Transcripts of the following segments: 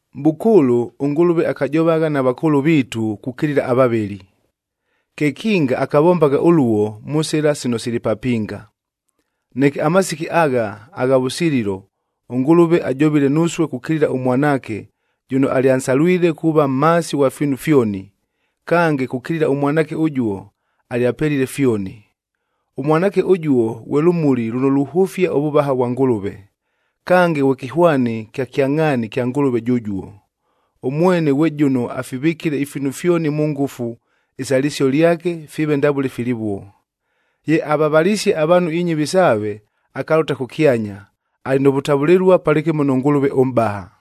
Mʼbʉkʉʉlʉ, ʉNgʉlʉve akajovagha na vakʉʉlʉ viitu kukilila avavɨli. Kekinga akavombagha ʉluo, mʉ sɨla sino sili papinga. Neke amasiki agha, agha vʉsililo ʉNgʉlʉve ajovile nusue kukilila ʉMwanaakea jʉno alyansalwile kuuva mhaasi ghwa fiinu fyoni, kange kukilila ʉMwanaake ʉjuo alyapelile fyoni. ɄMwanaake ʉjuo ghwe lʉmuli lʉno luhʉfia ʉvʉvaha vwa Ngʉlʉve, kange ghwe kɨhwani kya kyangʼhaani kya Ngʉlʉve jʉjuo. Ʉmwene ghwe jʉno afivɨkile ifiinu fyoni mʉ ngʉfu isa lɨsio lyake fiive ndavʉle filivuo. Ye avavalisie avaanhu inyɨvi saave, akalʉta kʉkyanya, alɨ nʉ vʉtavʉlɨlua palɨkɨmo nʉ Ngʉlʉve ʉMʼbaha.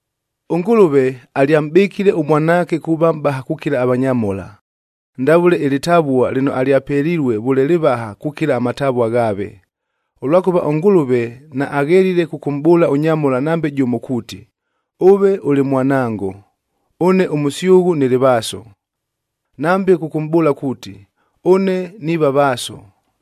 ɄNgʉlʉve alyamʼbɨkile ʉMwanaake kuuva mʼbaha kukila avanyamhola, ndavʉle ɨlɨtavua lɨno alyapelilue vʉle lɨvaha kukila amatavua ghaave. Ʉlwakʉva ʉNgʉlʉve naaghelile kʉkʉmʼbʉʉla ʉnyamhola nambe jʉmo kuuti, “Ʉve ʉlɨ Mwanango, ʉne ʉmʉsyʉghʉ nɨlɨ Vaaso.”b Nambe kʉkʉmʼbʉʉla kuuti, “Ʉne niiva Vaaso,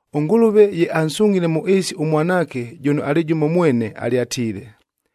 ɄNgʉlʉve ye ansungʼhile mʉ ɨɨsi ʉMwanaake jʉno alɨ jʉmo mwene alyatiile,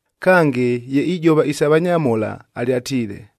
Kange, ye ijova isa vanyamhola, alyatiile,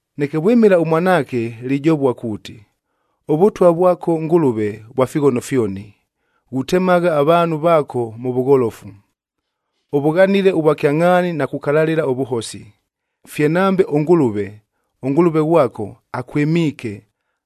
Neke vwɨmɨla ʉMwanaake, lijovua kuuti, “ɄVʉtwa vwako Ngʉlʉve, vwa fighono fyoni, ghutemagha avaanhu vaako mʉ vʉgholofu. Ʉvʉghanile ʉvwakyangʼhaani na kukalalɨla ʉvʉhosi, fye nambe ʉNgʉlʉve, ʉNgʉlʉve ghwako, akwɨmiike,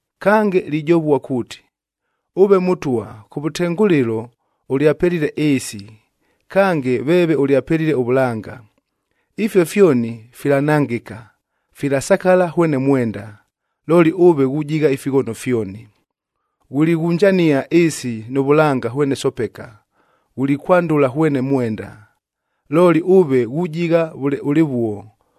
Kange lijovua kuuti, “Ʉve Mʉtwa kʉvʉtengʉlɨlo ʉlyapelile ɨɨsi, kange veeve ʉlyapelile ʉvʉlanga. Ifio fyoni filanangɨka, filasakala hwene mwenda, looli ʉve ghujigha ifighono fyoni. Ghulighunjania ɨɨsi nʉ vʉlanga hwene sopeka, ghulikwandʉla hwene mwenda. Looli ʉve ghujigha vʉle ʉlɨvuo,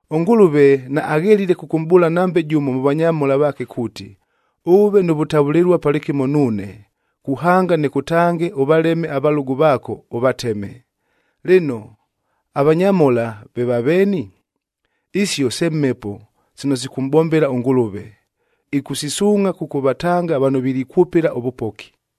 ɄNgʉlʉve naaghelile kʉkʉmʼbʉʉla nambe jʉmo mʉ vanyamhola vaake kuuti, “Ʉʉve nʉ vʉtavʉlɨlua palɨkɨmo nuune, kuhanga nɨkʉtange ʉvaleme avalʉgʉ vaako, Lɨno, avanyamhola ve vaveeni? Isio se mhepo sino sikʉmʼbombela ʉNgʉlʉve, ɨkʉsisuungʼha kʉkʉvatanga vano vilikwʉpɨla ʉvʉpoki.